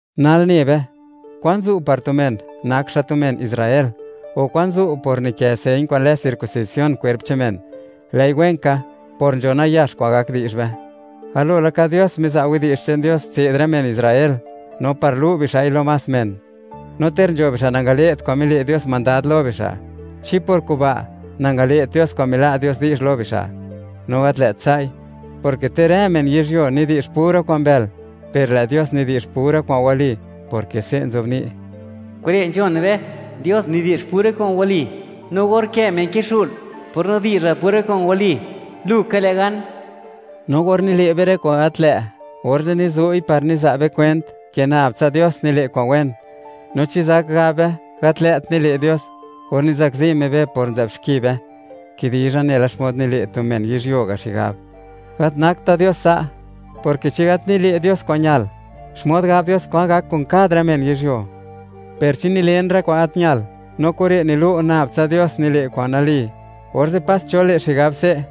Nal ne be: “¿Kwan zu' par tu men, nak xa' tu men Israel?, o, ¿kwan zu' por nikë señ kwa'n lë circuncisión kwerp che'n men?” Lë'i wen ka, por nzho nayax kwa'n gak di'zh be. Galo laka, Dios miza' widi'zh che'n Dios tse'd rë men Israel, no par lu' bixa'i lo más men. No ter nzho bixa' nangale't kwa'n mile' Dios mandad lo bixa', ¿chi por kuba' nangale't Dios kwa'n mila' Dios di'zh lo bixa'? ¡No gat lë't sa'i!, porke ter rë men yizhyuo nidi'zh pura kwa'n mbël, per lë' Dios nidi'zh pura kwa'n wali, porke se' nzobni': Kure' nzhon be, Dios nidi'zh pura kwa'n wali, no or kë' men kixu'l, por nidi'zhal pura kwa'n wali, lu ka le' gan. No or nile' be rë kwa'n gat lë', orze' nizu'i par niza' be kwent, ke nab tsa Dios nile' kwa'n wen, no, ¿chi zak gab be, gat lë't nile' Dios or nizakzi Me be por nzë'b xki be? (Kidizha nela xmod nile' tu men yizhyuo ga' xigab.) Gat nakta' Dios sa', porke chi gat nile' Dios kwa'n ñal, ¿xmod gab Dios kwan gak kun kad rë men yizhyuo? Per chi nilen rë kwa'n gat ñalt, no kure' nilu' nab tsa Dios nile' kwa'n nali, orze' pas cho le' xigab se':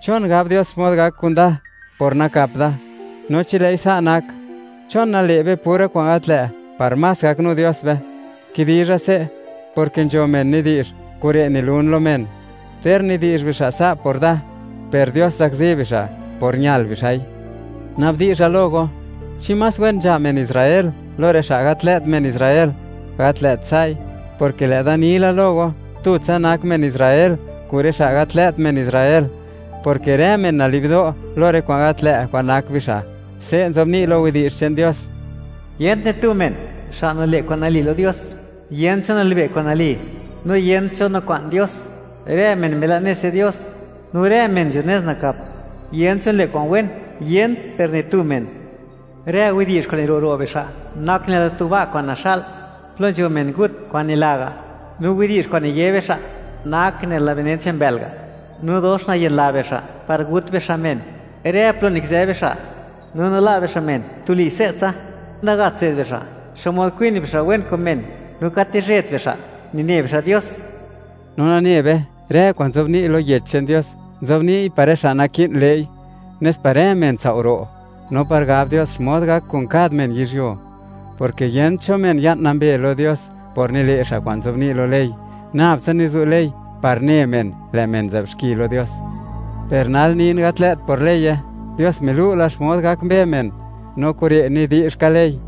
“¿Chon gab Dios xmod gak kuda por nakap da? No chi lë'i sa' nak, ¿chon nale' be pura kwa'n gat lë', par más gaknu Dios be?” Kidizha se', porke nzho men nidi'zh, kure' nilun lo men. Ter nidi'zh bixa' sa' por da, per Dios zakzi bixa' por ñal bixa'i. Na'bdizha lo go, ¿chi más wen nzha men Israel lo rë xa' gat lë't men Israel? ¡Gat lë't sa'i!, porke lë'da ni la lo go, tutsa nak men Israel kun rë xa' gat lë't men Israel, porke rë men nali'bdo' lo rë kwa'n gat lë' kwa'n nak bixa'. Se' nzobni' lo Yech che'n Dios: Yent ni tu men, xa' nile' kwa'n nali lo Dios; yent cho nilibe' kwa'n nali, no yent cho nikwa'n Dios. Rë men mila' nez che'n Dios, no rë men nzho nez nakap; yent cho nile' kwa'n wen, yent per ni tu men. Rë widi'zh kwa'n niro' ro' bixa' nak nela tu ba' kwa'n naxa'l, plo nzho men ngut kwa'n nila' ga'; no widi'zh kwa'n niye bixa', nak nela benen che'n mbë'l ga'; no dox nayenla bixa' par gut bixa' men, rë plo nikizë bixa', no nila' bixa' men tuli se'tsa. Nagat tse'd bixa' xmod kwin bixa' wen kun men, no gat nizhe'bt bixa', nine bixa' Dios. No nane be, rë kwa'n nzobni' lo Yech che'n Dios, nzobni'y par rë xa' naki'n le'i, nes par rë men tsao' ro', no par gab Dios xmod gak kun kad men yizhyuo, porke yent cho men ya'n nambe lo Dios por nile' xa' kwa'n nzobni' lo ley. Nabtsa nizu' ley par ne men, lë' men nzë'b xki lo Dios. Per nal nin gat lë't por leye. Dios milu' la xmod gak mbe men, no kure' nidi'zh ka ley,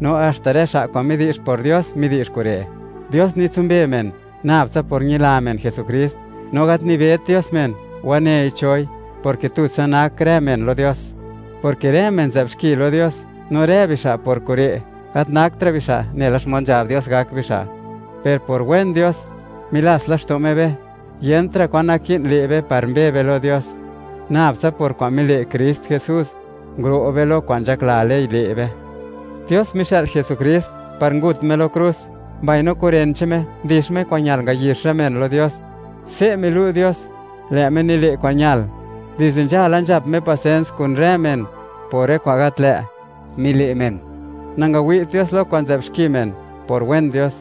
no haxta rë xa' kwa'n midi'zh por Dios, midi'zh kure'. Dios nitsumbe men nab tsa por ñila men Jesukrist, no gat nibet Dios men, wanei choi, porke tutsa nak rë men lo Dios, porke rë men nzë'b xki lo Dios, no rë bixa' por kure', gat naktra' bixa' nela xmod nzhab Dios, gak bixa'. Per por wen Dios, milats laxto' Me be, yentra' kwan naki'n le' be par mbe be lo Dios; nab tsa por kwa'n mile' Krist Jesús, nguro' be lo kwa'n nzhakla ley, le' be. Dios mixë'l Jesukrist par ngut Me lo krus; mbaino kun ren che'n Me, ndix Me kwa'n ñal ngayix rë men lo Dios. Se' milu' Dios, lë' Me nile' kwa'n ñal. Dizde nzhala, nzhap Me pasens kun rë men por rë kwa'n gat lë' mile' men; nangawi't Dios lo kwa'n nzë'b xki men por wen Dios.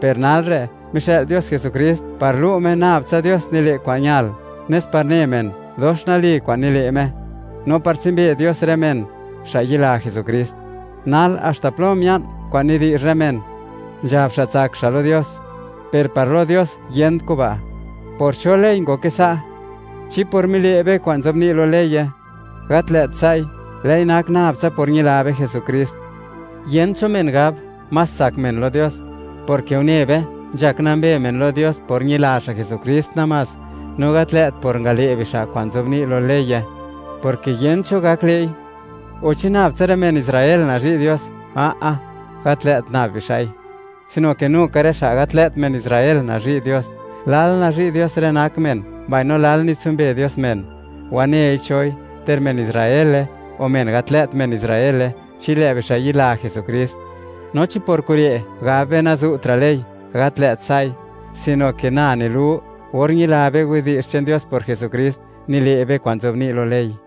Per nalre', mixë'l Dios Jesukrist par lu' Me, nab tsa Dios nile' kwa'n ñal, nes par ne men, dox nali kwa'n nile' Me, no par tsumbe Dios rë men, xa' yayila Jesukrist. Nal, ¿haxta plo mia'n kwa'n nidi'zh rë men, nzhab xa' tsak xa' lo Dios? Per par lo Dios, ¡yent kuba'! ¿Por cho ley ngoke sa'? ¿Chi por mile' be kwa'n nzobni' lo leye? Gat lë't sai', lë'i nak nab tsa por ñila be Jesukrist. Yent cho men gab, más tsak men lo Dios, porke une be, nzhak nambe men lo Dios por ñila xa' Jesukrist namás; no gat lë't por ngale' bixa' kwa'n nzobni' lo leye, porke yent cho gak le'i. O, ¿chi nab tsa rë men Israel nazhi' Dios? A'a, gat lë't nab bixa'i, sino ke nu ka rë xa' gat lë't men Israel nazhi' Dios. Lal nazhi' Dios rë nak men, mbaino lal nitsumbe Me men, wanei choi, ter men Israele o men gat lë't men Israel, chi lë' bixa' yila Jesukrist. No chi pur kure', ¿gab be, nazu'tra' ley? ¡Gat lë't sa'i!, sino ke na nilu, or ñila be widi'zh che'n Dios por Jesukrist, nile' be kwa'n nzobni' lo ley.